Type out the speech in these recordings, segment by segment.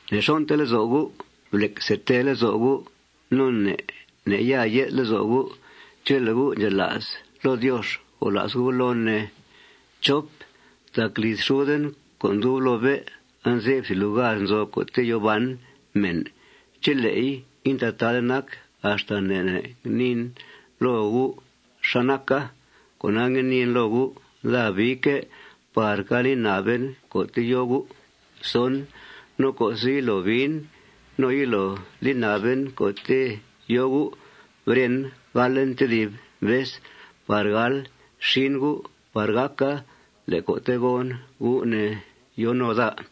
Ne'xon'te lezo' gu'. Blec see tee lezo' gu'. Ne' ne' ya ye'th lezo' gu'. Chele' gu' ndxela's loo Diox, gola's gu' loon, ne. Tac liz xuden co' ndub loo bé' anze'f thìb lugar nzo co'te' yòo ban mèn. Chele'i intataade nac, axta ne' ne' ngniin loo gu' xá naca. Cona, ngue niin loo gu': Daa biique' par ga li na'ben co'te' yo gu'. No co'se' yilo biin no yilo li na'ben co'te' yo gu', beren, galen tedib vez par gal xin gu' par gàca le' co'te' gon, gu', ne, yo no daa.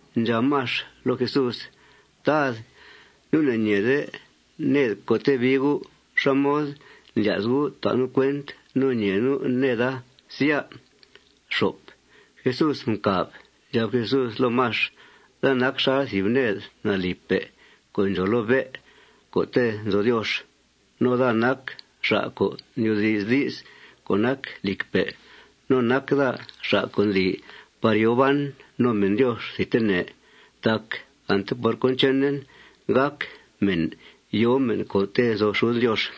Ndxab Max loo Jesús: ―Tad, nu' ne'ñeede ned co'te' bii U'. ¿Xá mod ndlya's U' ta' nu' cuent no ñee nu' neda, sya? Jesús mcàb. Ndxab Jesús loo Max: ―Daa nac xal thìb ned nalìpe' co' ndxòo loo bé' co'te' nzo Diox. No daa nac xa' co' ndyoodi's di's co' nac lìcpe'. No nac daa xa' co' ndli par yòo ban no mèn Diox thidtene. Tac ante por cón chenen gác mèn yòo mèn co'te' nzo xuden Diox.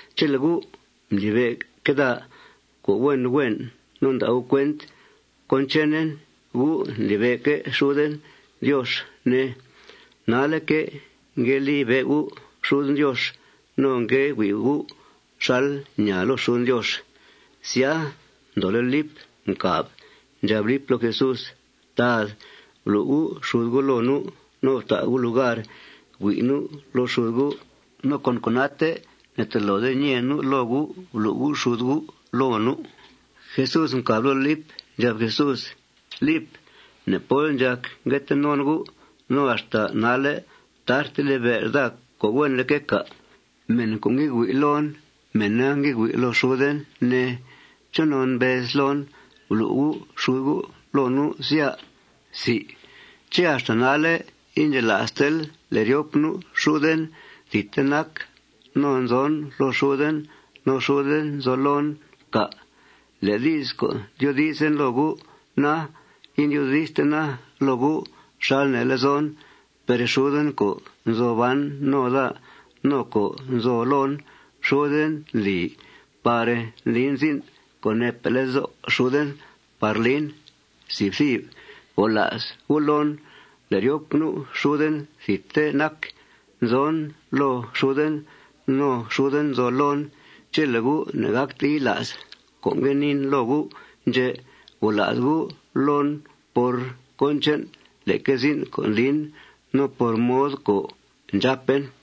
Chele' gu' ndlibe'que' daa co' huen huen no nda' gu' cuent cón chenen, gu' ndlibe'que' xuden Diox, ne. Nalle'que' ngue libe' gu' xuden Diox. No ngue hui' gu' xal ñaa loo xuden Diox. Sya, ndoole' Lip mcàb. Ndxab Lip loo Jesús: ―Tad, blu' U' xud U' loo nu' no fta' U' lugar hui' nu' loo xud U' no con cona'te ne'tolode ñee nu' loo U' blu' U' xud U' loo nu'. Jesús mcàb loo Lip. Ndxab Jesús: ―Lip, ne' pól ndxàc ngue tee non gu'. No ¿axta nalle' tarte libe'l daa co' huenleque', cà'? Mèn co' ngue hui' loon, mèna ngue hui' loo xuden, ne. ¿Chonon mbezl loon: Blu' U' xud U' loo nu', sya? ¿Ché' axta nalle' indxela'stel le' ryop nu' xuden thidte nac no nzon loo xuden no xuden nzo loon, cà'? Le' di's co' ndyoodizen loo gu' na, indyoodistena loo gu' xal nee lezon. Per xuden co' nzo ban no daa no co' nzo loon, xuden ndli par ndlin zin' co' neepe' lezo' xuden par lin. Gola's gu' loon le' ryop nu' xuden thidte nac. Nzon loo xuden no xuden nzo loon. Chele' gu' ne'gácte yila's cón ngue niin loo gu' ndxè', gola's gu' loon por cón che'n leque zin' co' ndlin no por mod co' ndxàpen.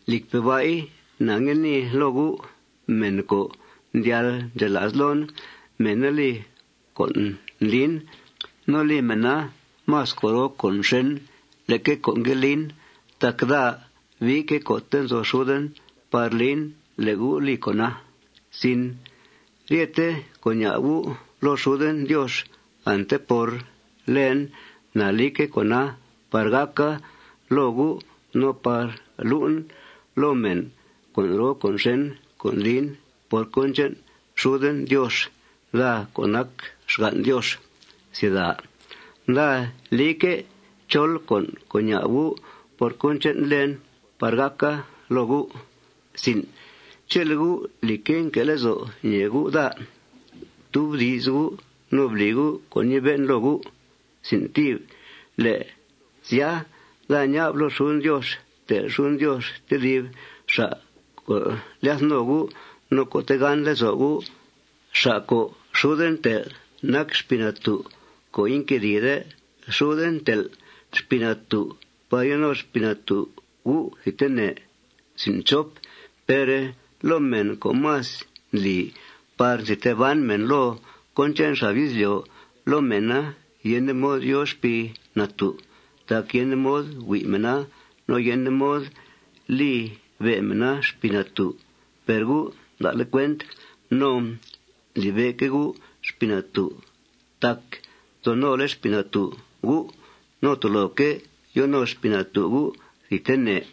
Lìcpe' ba'i, na ngue nii loo gu': Mèn co' ndyal ndxela's loon, mèna li con' ndlin. No li mèna más con' roo con' xèn leque con' ngue lin tac daa biique' co'te' nzo xuden par lin le' gu' li con'a. Ryete con' ña'b gu' loo xuden Diox ante por lèen, na lique' con'a par gàca loo gu' no par lu'en loo mèn con' roo con' xèn co' ndlin por cón che'n xuden Diox, daa co' nac xgan' Diox. Daa lique' chol con' co' ña'b gu' por cón che'n lèen par gàca loo gu'. Chele' gu', lìcque', nque' lezo' ñèe gu' daa, ftubdi's gu' no bli gu' con' ñibe'en loo gu'. Le' sya, daa ña'b loo xuden Diox tel' xuden Diox tedib xa' co' lyath no gu' no co' tegán lezo' gu'. Xa' co' xuden tel' nac Xpii Natú' co' inquedìide. Xuden tel' Xpii Natú' par yo no Xpii Natú' gu' thidtene. Per loo mèn co' más ndli par nzi tee ban mèn loo cón che'n xab izlyo', loo mèna yende mod yòo Xpii Natú'. Tac yende mod hui' mèna no yende mod libe' mèna Xpii Natú'. Per gu' nda'le' cuent no ndlibe'que' gu' Xpii Natú' tac nzo nole' Xpii Natú' gu'. No toloque' yo no Xpii Natú' gu' thidtene.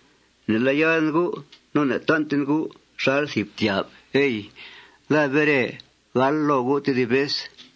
Ne'lá'ya'den gu' no ne'tan'ten gu' xal thìb ftyà'f, ey. Daa bere gal loo gu' tedib vez.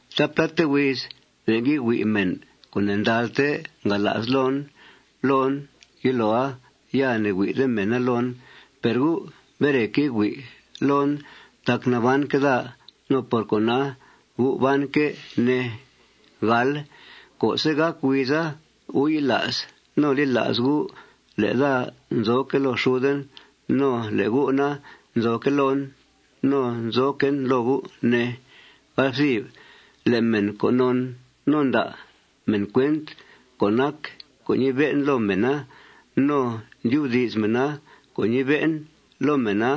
Taapláte huiz be' ngue hui' mèn co' ne'ndalte ngala's loon loon. Yiloa ya ne'hui'de mèna loon. Per gu' bereque' hui' loon tac nabanque' daa. No por cona, gu' banque', ne. Co'se' gàc huiza, gu' yila's no li la's gu' le' daa nzoque' loo xuden no le' gu' na, nzoque' loon no nzoquen loo gu', ne. Le' mèn co' non no nda' mèn cuent cón nac co' ñibe'en loo mèna, no ndyubdi's mèna co' ñibe'en loo mèna,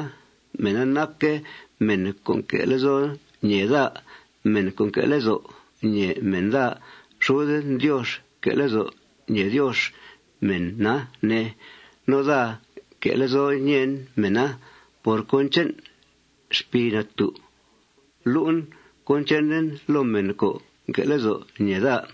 mèna nac mèn co' nque' lezo' ñèe daa. Mèn co' nque' lezo' ñèe mèn daa, xuden Diox nque' lezo' ñèe Diox mèna, ne. No daa nque' lezo' ñèen mèna. Por cón che'n Xpii Natú', lu'en cón chenen loo mèn co' nque' lezo' ñèe daa.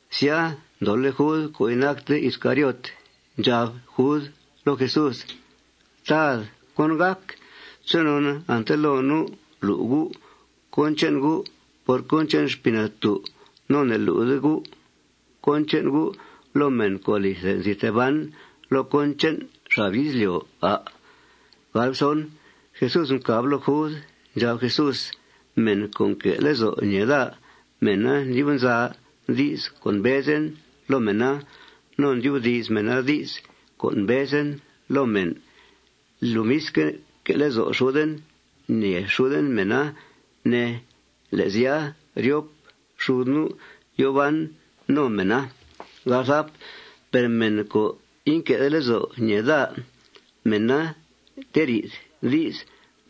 Sya, ndoole' Jud co' inacte Iscariot. Ndxab Jud loo Jesús: ―Tad, ¿cón gàc? ¿Chonon ante loo nu' lu' U' cón che'n U' por cón che'n Xpii Natú' no ne'lu'de U' cón che'n U' loo mèn co' alithe nzi tee ban loo cón che'n xab izlyo', à'? Jesús mcàb loo Jud. Ndxab Jesús: ―Mèn co' nque' lezo' ñèe daa, mèna ndyub nza di's co' mbezen loo mèna, no ndyubdi's mèna di's co' mbezen loo mèn. Lomisque', que' lezo' xuden ñèe xuden mèna, ne. Le' sya, ryop xud nu' yòo ban no mèna. Per mèn co' inque'de lezo' ñèe daa, mèna nteri'th di's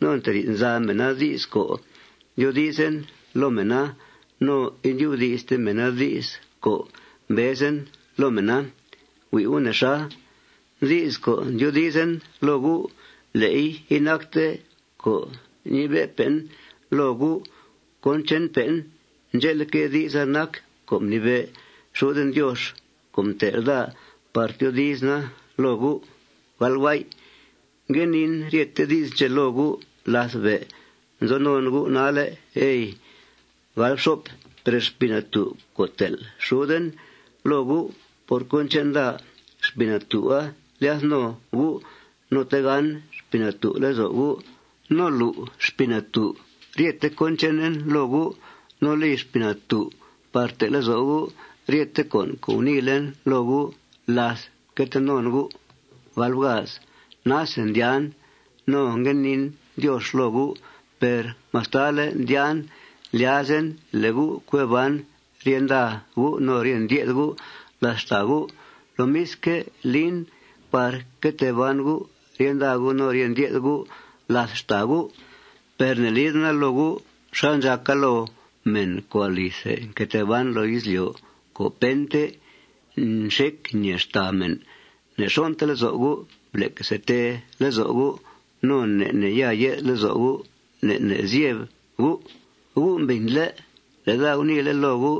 no nteri'th nza mèna di's co' ndyoodizen loo mèna no indyubdi'ste mèna di's co' mbezen loo mèna. Hui' gu' nexa. Di's co' ndyoodizen loo gu', le'i inacte co' ñibe'pe'en loo gu' cón che'npe'en. Ndxe'leque', di'sa nac co' mnibe' xuden Diox co' mtel' daa par tyoodizena loo gu'. Ngue niin ryete di's ndxè' loo gu' láth be' nzo non gu' nalle', ey. Per Xpii Natú' co' tel' xuden loo gu' por cón che'n daa, Xpii Natú'a lyath no gu'. No tegán Xpii Natú' lezo' gu'. No lu' Xpii Natú' ryethe cón chenen loo gu'. No li Xpii Natú' par te' lezo' gu' ryete con' co' guniilen loo gu' láth mque tee non gu'. Nase ndyàan no ngue niin Diox loo gu'. Per mastale' ndyàan, ndlyazen le' gu' cue ban rye nda gu' no rye ndye'th gu' làth xtàa gu'. Lomisque', lin par que tee ban gu' rye nda gu' no rye ndye'th gu' làth xtàa gu'. Per ne'lidena loo gu' xal ndxàca loo mèn co' alithe nque tee ban loo izlyo' co' pente nxec ñèe xtàa mèn. Ne'xon'te lezo' gu'. Blec see tee lezo' gu'. Ne' ne' ya ye'th lezo' gu'. Ne' ne' zyeb gu'. Gu' mbìnle' le' daa guniile' loo gu'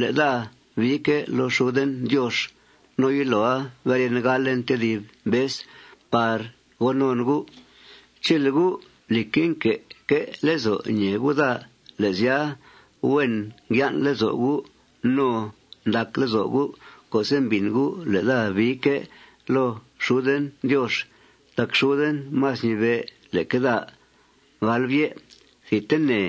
le' daa biique' loo xuden Diox. No yiloa beren, galen tedib vez par go non gu'. Chele' gu', lìcque', nque'que' lezo' ñèe gu' daa, le' sya, huen ngyan' lezo' gu' no ndac lezo' gu' co'se' mbìn gu' le' daa biique' loo xuden Diox tac xuden más ñibe' leque daa. Thidtene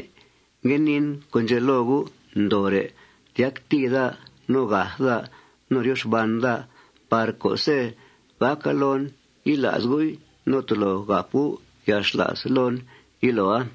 ngue niin con' ndxè' loo gu' ndooore' tyactìi daa no gath daa no ryo xban daa par co'se' gàca loon, yila's gu'i no tolo gàp gu' yalxla's loon yiloa.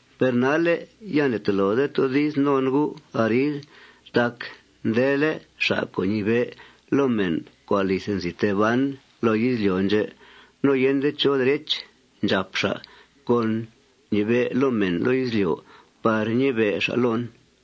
Per nalle' ya ne'tolode toodi's non gu' arid tac ndele' xa' co' ñibe' loo mèn co' alithe nzi tee ban loo izlyo' ndxè'. No yende chó derech ndxàp xa' co' ñibe' loo mèn loo izlyo' par ñibe' xa' loon.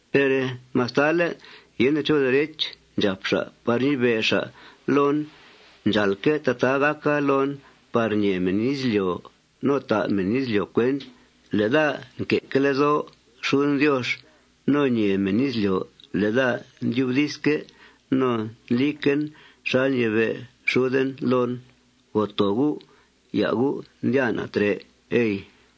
Per mastale' yende chó derech ndxàp xa' par ñibe' xa' loon, ndxàalque' tataa gàca loon par ñee mèn izlyo' no ta' mèn izlyo' cuent le' daa nque'que' lezo' xuden Diox no ñee mèn izlyo' le' daa ndyubdizque' no ndliquen xal ñibe' xuden loon. Goo too gu'. Ya' gu' ndyàa na' trè', ey.